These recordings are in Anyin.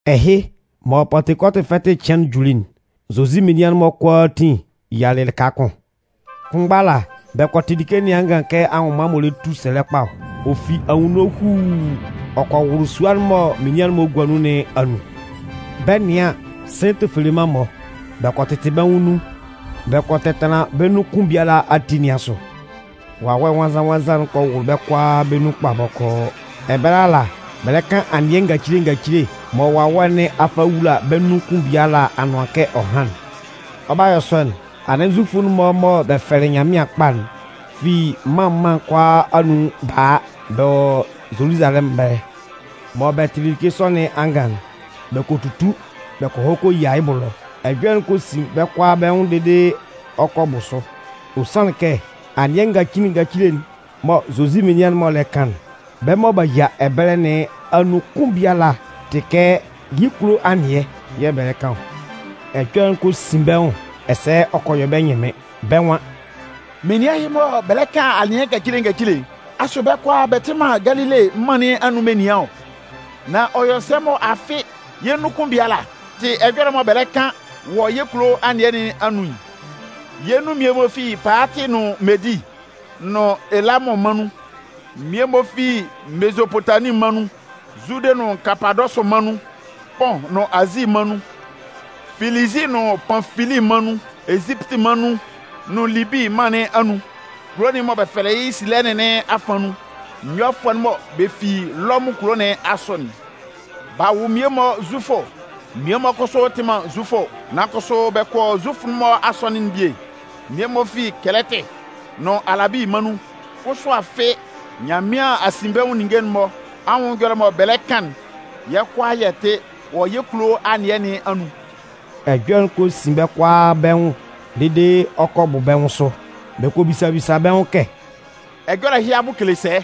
Ɛhɩ, mɔ Pantekɔtʋ fɛtɩ cɩan'n juli'n, Zozi menian'n-mɔ kʋalaatin yialɩ lɩka kʋn. Kʋnmgba ala, bɛ kɔ tɩ like nɩn angan kɛ anwʋnman m'ɔ lɛ tu sɛlɛ kpa ɔ. Ɔ fi anwunno huuu, ɔ kɔ wʋlʋ sua'n mɔ menian'n-mɔ gua nun nɩn anun. Bɛ 'nɩan an, sɩ̂n tofeleman-mɔ. Bɛ kɔ tɩtɩ bɛ́ nwʋn nun, bɛ kɔ tɛtanlan bɛ́ nun kʋn biala ati nɩn asʋ. Wawɛ Nwannzan-nwannzan'n kɔ wʋlʋ bɛ́ kʋalaa bɛ́ nun kpa bɔkɔɔ. Ɛbɛlɛ ala, bɛ lɛ kan anɩɛ ngacile ngacile mɔ Wawɛ nɩn a fa a wula bɛ́ nun kʋn biala anʋan kɛ ɔ hán'n. Ɔ 'ba yɔ sɔ'n, anɩn Zufʋ'n-mɔ mɔ bɛ fɛlɩ Nyanmɩan kpa'n fi mân mân'n kʋalaa anun ba a, bɛ wɔ Zoluzalɛmʋn ɛbɛlɛ. Mɔ bɛ tɩlɩ like sɔ nɩn angan'n, bɛ kɔ tutu bɛ kɔ hɔ kɔ yia yɩ́ bʋ ɛlɔ. Ɛjɔlɛ'n kɔ sin bɛ́ kʋalaa bɛ́ nwʋn dede ɔ kɔ bʋ sʋ. Ɔ sanlɩn kɛ, anɩɛ ngacile ngacile'n mɔ Zozi menian'n-mɔ lɛ kan'n, bɛ́ mɔ b'a yia ɛbɛlɛ nɩn anun kʋn biala tɩ kɛ yɩ́ kulo anɩɛ yɛ̂ bɛ lɛ kan ɔ. Ɛjɔlɛ'n kɔ sin bɛ́ nwʋn ɛsɛ ɔ kɔ yɔ bɛ́ ɛnyɩnmɩn. Bɛ́ nwan: “Menian ɛhɩ-mɔ mɔ bɛ lɛ kan anɩɛ ngacile ngacile'n, asʋ bɛ́ kʋalaa bɛ tɩ man Galile mân nɩn anun menian ɔ? Nan ɔ yɔ sɛ mɔ afɩ yɛ́ nun kʋn biala tɩ ɛjɔlɛ'n mɔ bɛ lɛ kan wɔ yɛ́ kulo anɩɛ nɩn anun'n? Yɛ́ nun mmie-mɔ fi Paatɩ nʋn Medi nʋn Elamʋn mân nun. Mmie-mɔ fi Mezopotamin mân nun, Zude nʋn Kapadɔsʋ mân nun, Pʋn nʋn Azi mân nun, Filizi nʋn Panfili mân nun, Ezipiti mân nun nʋn Libi mân nɩn anun kulo'n mɔ bɛ fɛlɛ yɩ́ Silɛnɩn nɩn afan nun. Nyɔfʋɛ'n mɔ bɛ fi Lɔmʋn kulo nɩn asʋ'n, b'a wʋ mmie-mɔ Zufʋ, mmie-mɔ kʋsʋ tɩ man Zufʋ, nan kʋsʋ bɛ kɔ Zufʋ'n-mɔ asɔnɩn'n bie. Mmie-mɔ fi Kɛlɛtɩ nʋn Alabi mân nun. Kʋsʋ afɩ, Nyanmɩan asinbɛnwʋn ninnge'n-mɔ anwʋn ɛjɔlɛ'n mɔ bɛ lɛ kan'n, yɛ́ kʋalaa yɛ tɩ wɔ yɛ́ kulo anɩɛ nɩn anun!” Ɛjɔlɛ'n kɔ sin bɛ́ kʋalaa bɛ́ nwʋn dede ɔ kɔ bʋ bɛ́ nwʋn sʋ. Bɛ kɔ bisa bisa bɛ́ nwʋn kɛ: “Ɛjɔlɛ ɛhɩ abʋ kele sɛ?”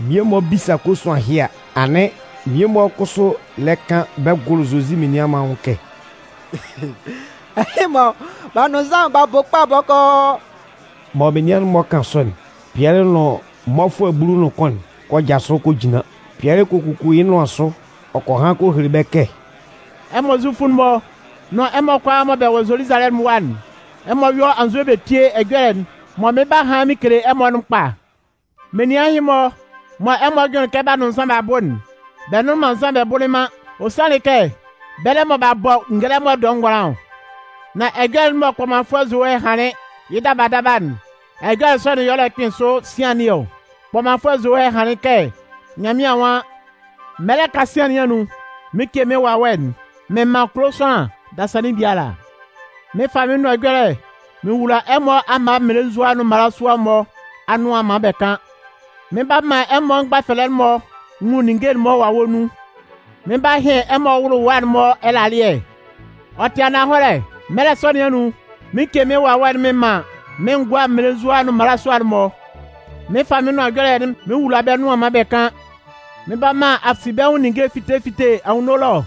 Mmie-mɔ 'bisa kosuan ɛhɩ a, anɩn mmie-mɔ kʋsʋ lɛ kan bɛ gʋlʋ Zozi menian'n-mɔ anwʋn kɛ: “Ɛhɩ-mɔ, b'a nʋn nzan b'a bʋ kpa bɔkɔɔ!” Mɔ menian'n-mɔ 'kan sɔ'n, Pɩɛlɩ nʋn mmɔfʋɛ bulu nʋn kʋn'n kɔ jasʋ kɔ jinlan. Pɩɛlɩ kɔ kuku yɩ́ nʋan sʋ ɔ kɔ han kɔ hele bɛ́ kɛ: “Ɛmɔ Zufʋ'n-mɔ nʋn ɛmɔ kʋalaa mɔ bɛ wɔ Zoluzalɛmʋn ɛwa'n, ɛmɔ yɔ́ anzʋɛ bɛ tíe ɛjɔlɛ'n mɔ mɩn 'ba han mɩn kele ɛmɔ'n kpa. Menian ɛhɩ-mɔ mɔ ɛmɔ jʋnlɩn kɛ b'a nʋn nzan b'a bʋ'n, bɛ nnʋnlɩn man nzan bɛ bʋlɩ man. Ɔ sanlɩn kɛ, bɛlɛ mɔ b'a bɔ ngɛlɛmɔ dɔɛ ngʋanlan ɔ. Nan ɛjɔlɛ'n mɔ kpɔmanfʋɛ Zowɛ hanlɩn yɩ́ daba daba'n, ɛjɔlɛ sɔ'n yɛ̂ ɔ lɛ kpɩn sʋ sian nɩn ɔ. Kpɔmanfʋɛ Zowɛ hanlɩn kɛ Nyanmɩan nwan: Mɛlɛ kasian nɩn anun, mɩn 'ce mɩn Wawɛ'n mɩn man kulo sʋanlan dasannin biala. Mɩn 'fa mɩ́n nʋan ɛjɔlɛ'n mɩn wula ɛmɔ amma mmelenzua nʋn mmalasua'n-mɔ anʋan maan bɛ kan. Mɩn 'ba man ɛmɔ mgbafɛlɛ'n-mɔ nwun ninnge'n-mɔ Wawɛ nun. Mɩn 'ba hɩn ɛmɔ mmɩlɩwa'n-mɔ ɛlalɩɛ. Ɔ tɩ ananhɔlɛ, mɛlɛ sɔ nɩn anun, mɩn 'ce mɩ́n Wawɛ'n mɩn man mɩ́n ngʋa mmelenzua nʋn mmalasua'n-mɔ. Mɩn 'fa mɩ́n nʋan ɛjɔlɛ'n mɩn wula bɛ́ nʋan maan bɛ kan. Mɩn 'ba man asinbɛnwʋn ninnge fite fite anwunno ɛlɔ.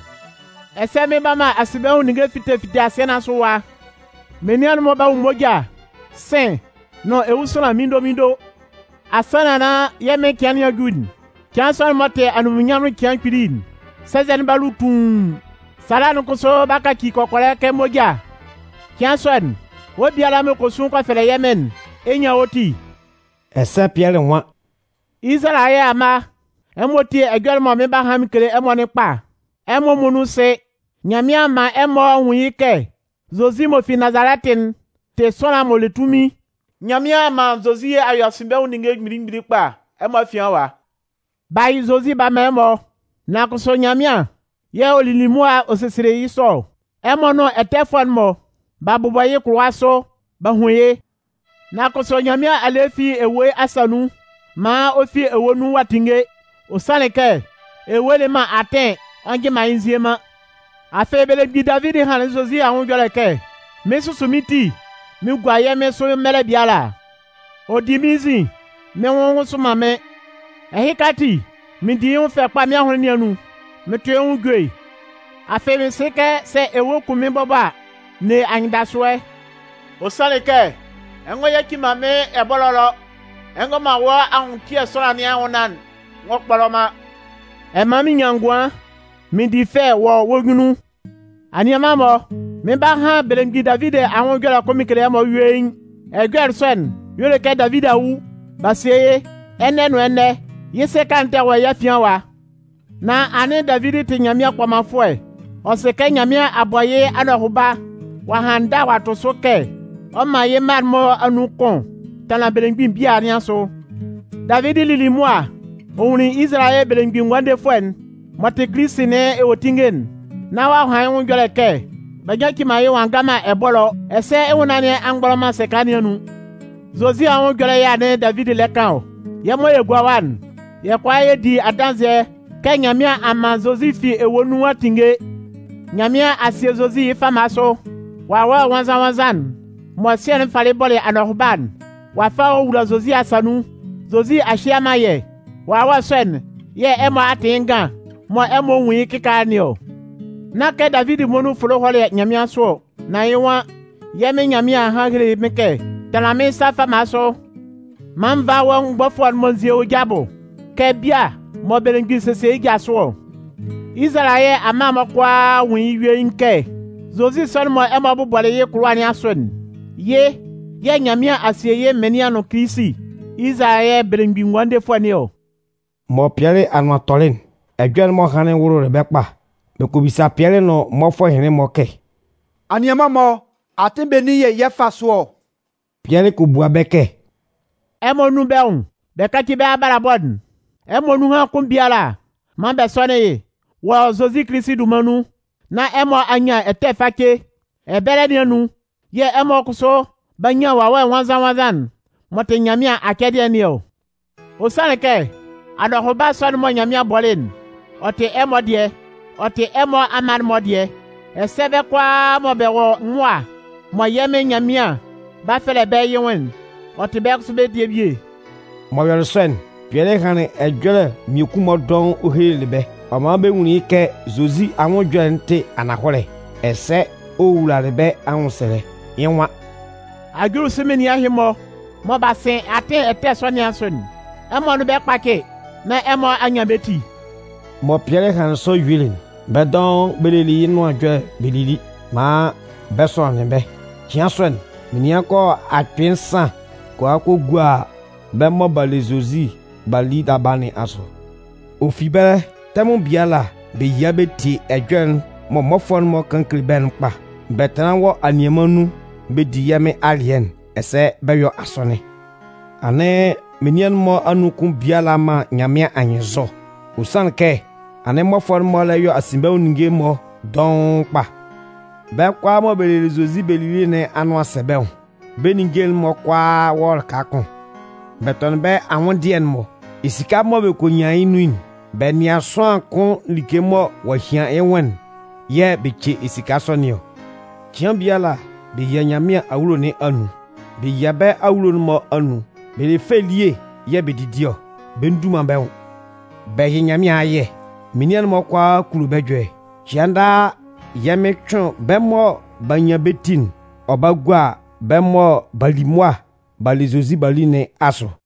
Ɛsɛ mɩn 'ba man asinbɛnwʋn ninnge fite fite asɩɛ nɩn asʋ ɛwa. Menian'n-mɔ 'ba nwun moja, sɩ̂n nʋn ewusanlan minndominndo. Asannan nán yɛ́ Mɩn cɩan nɩn a ju'n, cɩan sɔ'n m'ɔ tɩ anunminnyanmʋn cɩan kpili'n, sɛnzɛ'n b'a lu tuun, sala'n kʋsʋ 'ba kaci kɔkɔlɛ kɛ moja. Cɩan sɔ'n, wɔ́ biala mɔ ɛ kɔ sun kɔ fɛlɛ yɛ́ Mɩn'n, ɛ 'nyan wɔ́ ti.” Ɛsɛ Pɩɛlɩ nwan: “Izalayɛ amma, ɛmɔ tíe ɛjɔlɛ'n mɔ mɩn 'ba han mɩn kele ɛmɔ'n kpa. Ɛmɔ muonun sɩ, Nyanmɩan a man ɛmɔ a nwun yɩ́ kɛ Zozi m'ɔ fi Nazalɛtɩ'n tɩ sʋanlan m'ɔ le tunmin. Nyanmɩan a man Zozi a yɔ asinbɛnwʋn ninnge mgbili mgbili kpa ɛmɔ afian ɛwa. B'a yɩ Zozi b'a man ɛmɔ. Nan kʋsʋ Nyanmɩan yɛ̂ ɔ lili mʋa ɔ sesielɩ yɩ́ sɔ ɔ. Ɛmɔ nʋn ɛtɛfʋɛ'n-mɔ, b'a bʋbɔ yɩ́ kʋlʋwa sʋ b'a hun yɩ́. Nan kʋsʋ Nyanmɩan a le yɩ́ fi ewue asa nun maan ɔ fi ewue nun ɔ'a tinnge. Ɔ sanlɩn kɛ, ewue le man atɩn ɔ njɩ man yɩ́ nzie man. Afɩ belemgbin Davidi hanlɩn Zozi anwʋn ɛjɔlɛ kɛ: Mɩn susu mɩ́n ti mɩn gua yɛ́ Mɩn sʋ mɛlɛ biala. Ɔ di mɩ́n nzin, mɩ́n nwʋn nwʋsʋ man mɩ́n. Ɛhɩka ati, mɩn di yɩ́ nwʋn fɛ kpa mɩ́n ahʋnlɩn nɩn anun, mɩn tʋ yɩ́ nwʋn ejue. Afɩ mɩn sɩ kɛ sɛ ewue kun mɩ́n bɔbɔ a, n ne anyɩndasʋɛ. Ɔ sanlɩn kɛ, ɛ ngɔ yaci man mɩ́n ɛbɔlɔ ɛlɔ, ɛ ngɔ man wɔ́ anwʋntɩɛ sʋanlan nɩn anwʋnnaan'n ngɔ kpɔlɔ man. Ɛ 'man mɩn nyan ngʋan mɩn di fɛ wɔ wɔ́ nyunnun. “Anianman-mɔ, mɩn 'ba han belemgbin Davidi anwʋn ɛjɔlɛ kʋn mɩn kele ɛmɔ yuein. Ɛjɔlɛ sɔ'n y'ɔ le kɛ Davidi a wu, b'a sie yɩ́. Ɛnɛ nʋn ɛnɛ yɩ́ sɛka'n tɛ wɔ yɛ́ afian ɛwa. Nan anɩn Davidi tɩ Nyanmɩan kpɔmanfʋɛ. Ɔ sɩ kɛ Nyanmɩan a bɔ yɩ́ anɔhʋba ɔ'a han ndâ ɔ'a tʋ sʋ kɛ ɔ 'man yɩ́ mma'n-mɔ anun kʋn tanlan belemgbin bia nɩn asʋ. Davidi lili mʋa ɔ nwunlin Izalayɛ Belemgbin Ngʋandefʋɛ'n m'ɔ tɩ Kilisi nɩn ewuetinnge'n, nán ɔ'a han yɩ́ nwʋn ɛjɔlɛ kɛ: B'a nyaci man yɩ́ maan ɔ'a nga man ɛbɔlɔ, ɛsɛ yɩ́ nwʋnnaan nɩn a mgbɔlɔ man sɛka nɩn anun. “Zozi anwʋn ɛjɔlɛ yɛ̂ anɩn Davidi lɛ kan ɔ. Yɛ́ mɔ yɛ gua ɛwa'n, yɛ́ kʋalaa yɛ di adanzɩɛ kɛ Nyanmɩan a man Zozi fi ewue nun a tinnge. Nyanmɩan a sie Zozi yɩ́ fama sʋ. Wawɛ Nwannzan-nwannzan'n mɔ Sɩɛ'n falɩ bɔlɩ anɔhʋba'n, ɔ'a fa ɔ a wula Zozi asa nun. Zozi a hye a man yɛ́. Wawɛ sɔ'n yɛ̂ ɛmɔ a tɩ yɩ́ ngan mɔ ɛmɔ nwun yɩ́ kɩkaala nɩn ɔ. “Nán kɛ Davidi muonun fʋlɩ hɔlɩ nyanmɩansʋ ɔ, nan yɩ́ nwan: Yɛ́ Mɩn Nyanmɩan a han a hele mɩ́n Mɩn kɛ: Tanlan mɩ́n sa fama sʋ maan nvá wɔ́ mgbɔfʋɛ'n-mɔ n zíe wɔ ja abɔ kɛ bia mɔ belemgbin sesie yɩ́ ja sʋ ɔ. “Izalayɛ amma'n-mɔ kʋalaa nwún yɩ́ yuein kɛ, Zozi sɔ'n mɔ ɛmɔ bʋbɔlɩ yɩ́ kʋlʋwa nɩn asʋ'n, yɩ́ yɛ̂ Nyanmɩan a sie yɩ́ Mɩnlɩan nʋn Kilisi, Izalayɛ Belemgbin Ngʋandefʋɛ nɩn ɔ!” Mɔ Pɩɛlɩ anʋan tɔlɩ'n, ɛjɔlɛ'n m'ɔ hanlɩn'n wʋlʋlɩ bɛ́ kpa. Bɛ kɔ bisa Pɩɛlɩ nʋn mmɔfʋɛ ɛhɩnlɩn-mɔ kɛ: “Anianman-mɔ, atɩn benin yɛ̂ yɛ fá sʋ ɔ?” Pɩɛlɩ kɔ bua bɛ́ kɛ: “Ɛmɔ nún bɛ́ nwʋn bɛ káci bɛ́ abalabɔ'n. Ɛmɔ nunhan kʋn biala maan bɛ sɔ́nɩn yɩ́ wɔ Zozi Kilisi dunman nun, nán ɛmɔ a nyan ɛtɛ face. Ɛbɛlɛ nɩn anun yɛ̂ ɛmɔ kʋsʋ 'ba nyan Wawɛ Nwannzan-nwannzan'n m'ɔ tɩ Nyanmɩan acɛdɩɛ nɩn ɔ. Ɔ sanlɩn kɛ, anɔhʋba sɔ'n mɔ Nyanmɩan bɔlɩ'n, ɔ tɩ ɛmɔ dɩɛ, ɔ tɩ ɛmɔ amma'n-mɔ dɩɛ. Ɛsɛ bɛ́ kʋalaa mɔ bɛ wɔ mʋa mɔ yɛ́ Mɩn Nyanmɩan 'ba fɛlɛ bɛ́ yɩ́ nwʋn'n, ɔ tɩ bɛ́ kʋsʋ bɛ́ dɩɛ bie.” M'ɔ yɔlɩ sɔ'n, Pɩɛlɩ hanlɩn ɛjɔlɛ mmiekun-mɔ dɔʋn ɔ helelɩ bɛ́, ɔ man bɛ nwunlin yɩ́ kɛ Zozi anwʋn ɛjɔlɛ'n tɩ ananhɔlɛ, ɛsɛ ɔ wowulalɩ bɛ́ anwʋnsɛlɛ. Yɩ́ nwan: “Ajulisʋ menian ɛhɩ-mɔ mɔ b'a sɩn atɩn ɛtɛ nɩn asʋ'n, ɛmɔ nʋn bɛ́ kpácɩ nán ɛmɔ a nyan bɛ́ ti!” Mɔ Pɩɛlɩ hanlɩn sɔ yuelɩ'n, bɛ́ dɔʋn bɛ lelɩ yɩ́ nʋan ɛjɔlɛ'n bɛ lili maan bɛ sɔnɩnlɩn bɛ́. Cɩan sɔ'n, menian kɔ yɔ akpɩɩ nsan kɔ a kɔ gua bɛ́ mɔ b'a le Zozi b'a li daba nɩn asʋ. Ɔ fi ɛbɛlɛ, tɛmʋn biala, bɛ yia bɛ tie ɛjɔlɛ'n mɔ mmɔfʋɛ'n-mɔ kan kele bɛ́'n kpa. Bɛ tanlan wɔ anianman nun bɛ di yɛ́ Mɩn alɩɛ'n, ɛsɛ bɛ yɔ asɔnɩn. Anɩn menian'n-mɔ anun kʋn biala man Nyanmɩan anyɩnnzɔ, ɔ sanlɩn kɛ anɩn mmɔfʋɛ'n-mɔ lɛ yɔ asinbɛnwʋn ninnge-mɔ dɔʋn kpa. Bɛ́ kʋalaa mɔ bɛ lelɩ Zozi bɛ lili nɩn anʋan sɛ bɛ́ nwʋn, bɛ́ ninnge'n-mɔ kʋalaa wɔ lɩka kʋn. Bɛ tɔnɩn bɛ́ anwʋndɩɛ'n-mɔ. Esika mɔ bɛ kɔ nyan yɩ́ nun'n, bɛ nɩan sʋanlan kʋn like mɔ ɔ'a hian yɩ́ nwʋn'n yɛ̂ bɛ ce esika sɔ nɩn ɔ. Cɩan biala, bɛ yia Nyanmɩan awulo nɩn anun. Bɛ yia bɛ́ awulo'n-mɔ anun bɛ le fɛ elie yɛ̂ bɛ didi ɔ, bɛ ndu man bɛ́ nwʋn. Bɛ yɩ Nyanmɩan ayɛ. Menian'n-mɔ kʋalaa kulo bɛ́ ɛjɔlɛ. Cɩan daa, yɛ́ Mɩn cʋɩn bɛ́ mɔ b'a nyan bɛ́ ti'n ɔ ba gua bɛ́ mɔ b'a li mʋa b'a le Zozi b'a li nɩn asʋ.